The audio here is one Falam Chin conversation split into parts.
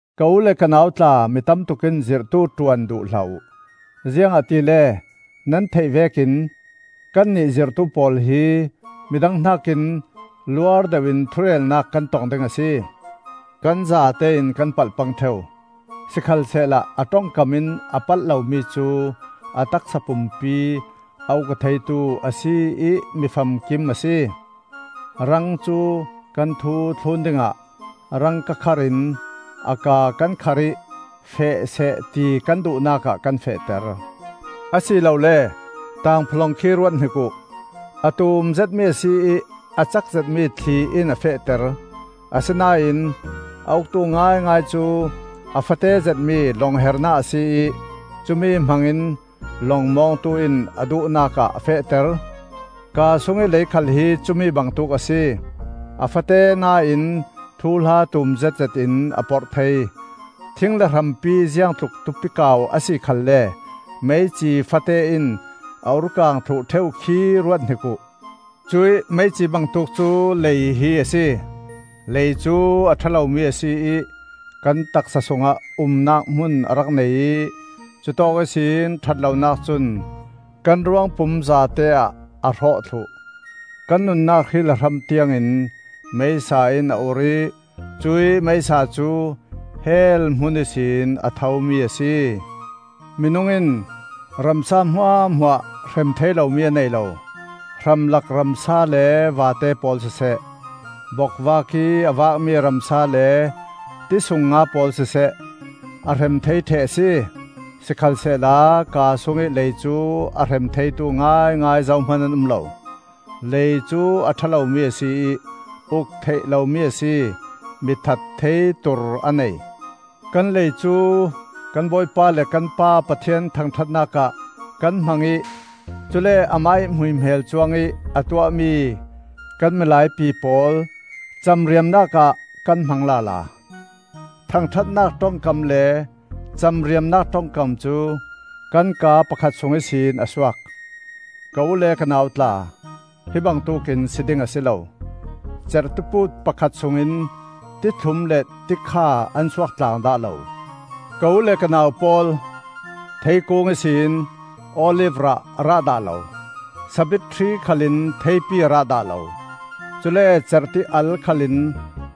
Ka u le ka nau tla, mi tamtuk in zirhtu ṭuan duh hlah uh. Ziangahtile nan theih vekin kannih zirhtu pawl hi midang hnakin luar deuhin thurelnak kan tong ding a si. Kan zatein kan palh pang ṭheu. Sikhalsehla a ṭongkam in a palh lomi cu a taksa pumpi a uk aw theitu a si ih mifamkim a si. Rang cu kan thu thlun dingah rang kakharh in a kaa kan kharh ih feh seh ti kan duhnakah kan fehter. Asilole tangphawlawng khi ruathnik uh: a tumzetmi a si ih a cak zetmi thli in a fehter; asina in a uktu ngaingai cu a fate zetmi lawng-hernak a si ih cumi hmangin lawng mawngtu in a duhnak ah a fehter. Kaa sungih lei khal hi cumi bangtuk a si; a fate na in thuhla tum zetzet in a porh thei. Thing le hrampi ziangtluk tupi kau a si khalle meici fate in a ur kang thluh ṭheu khi ruathnik uh. Cuih meici bangtuk cu lei hi a si. Lei cu a ṭha lomi a si ih kan taksa sungah umnak hmun a rak nei ih cutawk ihsin ṭhat lonak cun kan ruangpum zate-ah a hrawh thluh. Kan nunnak hri le hram tiangin meisa in a ur ih cuih meisa cu hell hmun ihsin a thomi a si. Minung in ramsa hmuahhmuah hrem thei lomi a nei lo; hramlak ramsa le vate pawl siseh, bokvak ih a vakmi ramsa le ti sung nga pawl siseh, a hrem thei ṭheh a si. Sikhalsehla kaa sungih lei cu a hrem theitu ngaingai zohman an um lo. Lei cu a ṭha lomi a si ih uk theih lomi a si; mi that thei tur a nei. Kan lei cu kan Bawipa le kan Pa Pathian thangṭhatnak ah kan hmang ih cule amah ih hmuihmel cuangih a tuahmi kan milaipi pawl camriamnak ah kan hmang lala. Thangṭhatnak ṭongkam le camriamnak ṭongkam cu kan kaa pakhat sung ihsin a suak. Ka u le ka nau tla, hi bangtuk in si ding a si lo. Cerh tipuut pakhat sungin ti thlum le ti kha an suak tlang dah lo. Ka u le ka nau pawl, theikung ihsin olif rah a rah dah lo; sabit hri khal in theipi a rah dah lo. Cule cerh ti-al khal in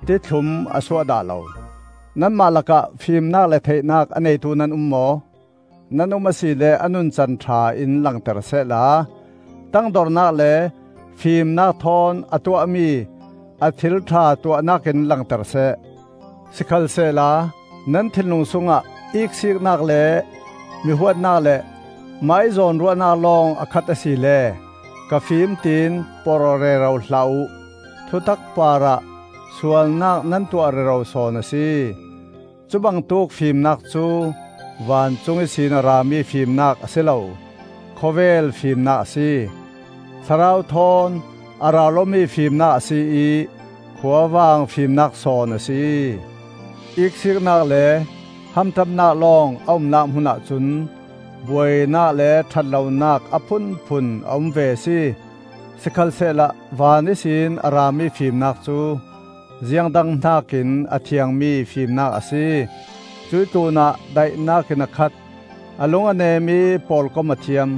tithlum a suah dah lo. Nanmah lakah fimnak le theihnak a neitu nan um maw? Nan um a si le a nuncan ṭha in langter sehla, tangdornak le fimnak thawn a tuahmi a thil ṭha tuahnak in langter seh. Sikhalsehla nan thinlung sungah iksiiknak le mi huatnak le mahih zawnruahnak lawng a khat asile ka fim tiin porh aw rero hlah uh; thutak parah sualnak nan tuah rero sawn a si. Cubangtuk fimnak cu vancung ihsin a rami fimnak a si lo; khawvel fimnak a si; thlarau thawn a ral awmi fimnak a si ih khuavang fimnak sawn a si. Iksiknak le hamṭamnak lawng a umnak hmunah cun buainak le ṭhat lonak a phunphun a um ve a si. Sikhalsehla van ihsin a rami fimnak cu ziang dang hnakin a thiangmi fimnak a si; cuih tlunah daihnak in a khat, a lung a nem ih pawlkom a thiam.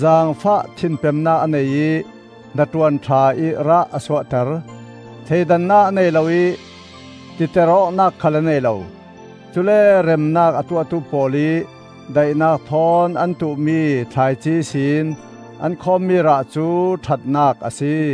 Zaangfah thinpemnak a nei ih hnaṭuan ṭha ih rah a suahter. Thleidannak a nei lo ih titer awknak khal a nei lo. Cule remnak a tuahtu pawl ih daihnak thawn an tuh-mi thlaici ihsin an khawmmi rah cu ṭhatnak a si.